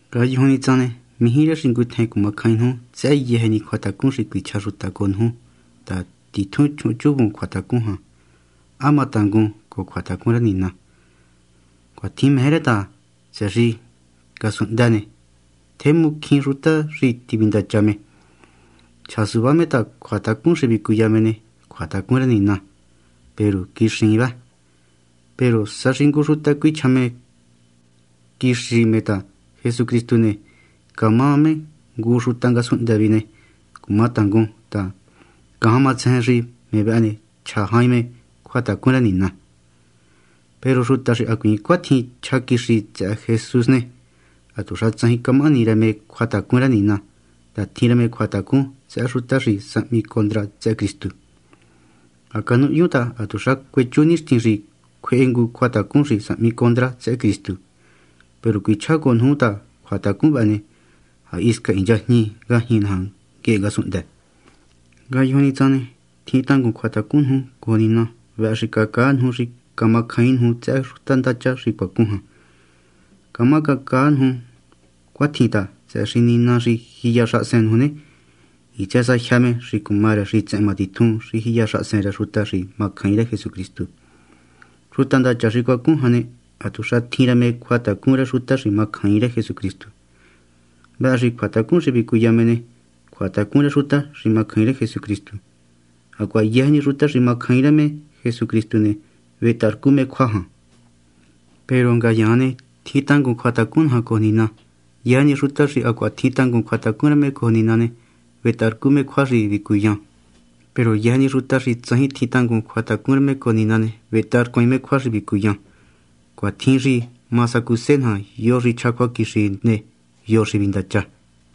Ngayujun ni tsan ne, mijí rë xi ngutjen cumacjain nuju tsëhë yëjë ni cjuatacun xi cuichja xuta cojo nuju ta titjun chjuhunchuvun cjuatacun jan, ¿há ma tangun cojo cjuatacun rë Nina? Cuatjin meje rë ta, tsëhë xi ngasunhndë ne, tjemu cjín xuta xi tivindacha me. Chja suvá me ta cjuatacun xi vicuya me ne, cjuatacun rë Nina, peru quixiin vë. Peru sa xi ngu xuta cuichja quixi me ta Jesucristu ne, camá me ngu xuta ngasunhndë vihi ne, cumangutacún ta, ngajan matsejen xi me vëhë ne, chja jain me cjuatacun rë Nina. Peru xuta xi hacuiin cuatjin chja quixi tsëhë Jesús ne, hatuxa tsajin camahani rë me cjuatacun rë Nina ta tjin rë me cjuatacun tsëhë xuta xi sahmi condra tsëhë Cristu. Ha canuhyun ta hatuxa cuechu nixtin xi cjuehe ngu cjuatacun xi sahmi condra tsëhë Cristu, peru cuichjá cojo nuju ta cjuatacun vëhë ne, ha hisca hinchajñi ngajñi naja nguehe ngasunhndë. Ngayujun ni tsan ne, tjin tangun cjuatacun nuju cojo Nina. Vëhë xi cacaa nuju xi camacjaain nuju tsëhë xuta ndacha xi cuacun jan. Camá cacaa nuju cuatjin ta, tsëhë xi Nina xi jiya xahasen nuju ne, hitsë sa jyë me xi cuma rë xitsehen matitjun xi jiya xahasen rë xuta xi macjaain rë Jesucristu. Xuta ndacha xi cuacun jan ne, hatuxa tjin rë me cjuatacun rë xuta xi macjaain rë Jesucristu. Vëhë xi cjuatacun xi vicuya me ne, cjuatacun rë xuta xi macjaain rë Jesucristu, hacuaha yëjë ni xuta xi macjaain rë Jesucristu ne, vetaharcu me cjua jan. Peru ngayaan ne, tjin tangun cjuatacun naja cojo Nina. Yëjë ni xuta xi hacuaha tjin tangun cjuatacun rë me cojo Nina ne, vetaharcu me cjua xi vicuyan. Peru yëjë ni xuta xi tsajin tjin tangun cjuatacun rë me cojo Nina ne, vetaharcuaain me cjua xi vicuyan. Cuatjin xi ma sacuse naja yo xi chja cjuaquixi ne, o yo xi vindacha.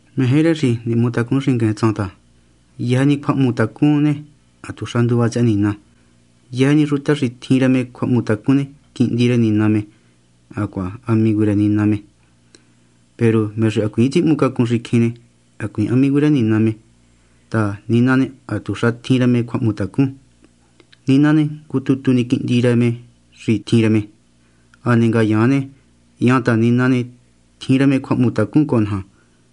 Meje rë xi nihmutacun xingueen tsan ta, yëjë ni cjuahmutacun ne, hatuxa nduva tsëhë Nina. Yëjë ni xuta xi tjin rë me cjuahmutacun ne, quihndi rë Nina me, hacuaha amigu rë Nina me. Peru me xi hacuiin tsihmucacun xicjin ne, hacuiin amigu rë Nina me ta, Nina ne, hatuxa tjin rë me cjuahmutacun. Nina ne, ngu tutu ni Quihndi xi tjin rë me. Hane ngayaan ne, hyan ta Nina ne, tjin rë me cjuahmutacun cojo naja,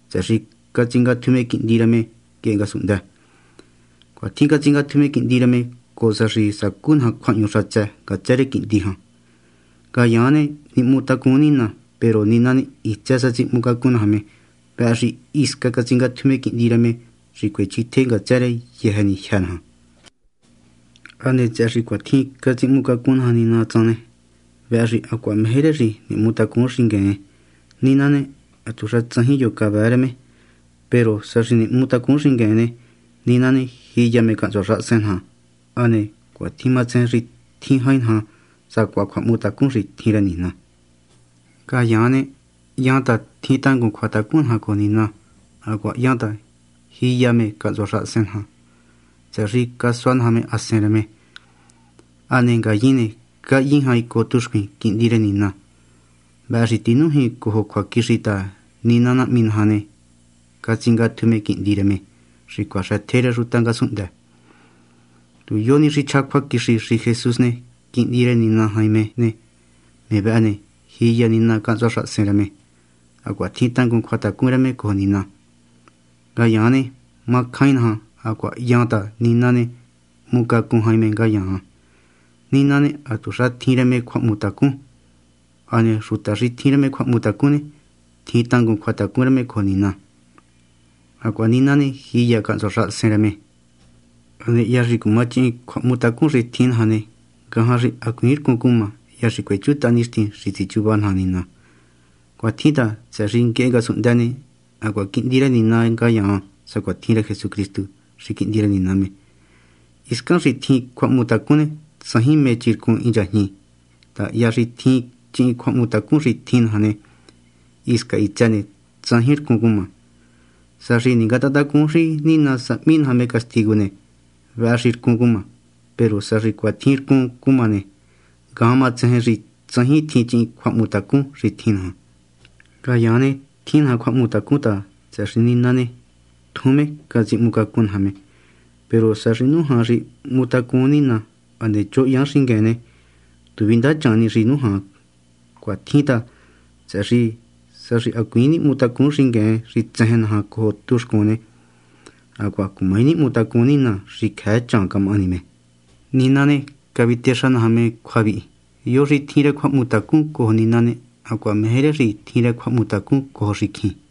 tsëhë xi catsingatju me Quihndi rë me nguehe ngasunhndë. Cuatjin catsingatju me Quihndi rë me, cojo sa xi sacú naja cjuahñu xatsë ngatsë rë Quihndi jan. Ngayaan ne, nihmutacun Nina. Peru Nina ne, hitsë sa tsihmucacun naja me. Vëhë xi hisca catsingatju me Quihndi rë me xi cuechjitje ngatsë rë yëjë ni jyë́ naja. Hane tsëhë xi cuatjin catsihmucacun naja Nina tsan ne, vëhë xi hacuaha meje rë xi nihmutacun xingueen. Nina ne, hatuxa tsajin yo xi cavëë rë me. Peru sa xi nihmutacun xingueen ne, Nina ne, jiya me cahntsua xahasen naja, hane cuatjin matsejen xi tjin jain naja sacuaha cjuahmutacun xi tjin rë Nina. Ngayaan ne, hyan ta tjin tangun cjuatacun naja cojo Nina hacuaha hyan ta jiya me cahntsua xahasen naja, tsëhë xi casua naja me Hasen rë me. Hane ngayin ne, cahyin jain cojo tuxcuin Quihndi rë Nina. Vëhë xi tinújin cojo cjuaquixi ta Nina Nahmi naja ne, catsingatju me Quihndi rë me, xi cuaxëtje rë xuta ngasunhndë. Tu yo ni xi chja cjuaquixi xi Jesús ne, Quihndi rë Nina jain me ne, me vëhë ne, jiya Nina cahntsua xahasen rë, hacuaha tjin tangun cjuatacun rë cojo Nina. Ngayaan ne, macjain naja hacuaha ha hyan ta Nina ne, hmucacun jain me ngayaan. Nina ne, hatuxa tjin rë me cjuahmutacun. Hane xuta xi tjin rë cjuahmutacun ne, tjin tangun cjuatacun rë me cojo Nina, hacuaha Nina ne, jiya cahntsua xahasen rë me. Hane hya xi cumachihin cjuahmutacun xi tjin naja ne, ngajan xi hacuiin rcun cuma, hya xi cuechutaha nixtin xi tsichuva naja Nina. Cuatjin ta, tsëhë xi nguehe ngasunhndë ne, hacuaha quihndi rë Nina ngayaan sacuatjin rë Jesucristu, xi Quihndi rë Nina me. Hiscan xi tjin cjuahmutacun ne, tsajin mé chircun hinchajñi ta hya xi ha tjin chihin cjuahmutacun xi tjin naja ne, hisca hitsë ne, tsajin rcun cuma. Sa xi ningatahantacun xi Nina sahmi naja me castigu ne, vëhë xi rcun cuma. Peru sa xi cuatjin rcun cuma ne, ngajan matsejen xi tsajin tjin chihin cjuahmutacun xi tjin naja. Ngayaan ne, tjin naja cjuahmutacun ta, tsëhë xi Nina ne, tjun me catsihmucacun naja me. Peru sa xi nújan xi nihmutacun Nina, hane choho hyan xingueen ne, tu vindachan ni xi nújan. Cuatjin ta, tsëhë xi sa xi hacuiin nihmutacun xingueen xi tsejen naja cojo tuxcun ne, hacuaha cumaji nihmutacun Nina xi cjëë camahani chaan me. Nina ne, cavitexa naja me cjua vihi: yo xi tjin rë cjuahmutacun cojo Nina ne, hacuaha meje rë xi tjin rë cjuahmutacun cojo xicjin.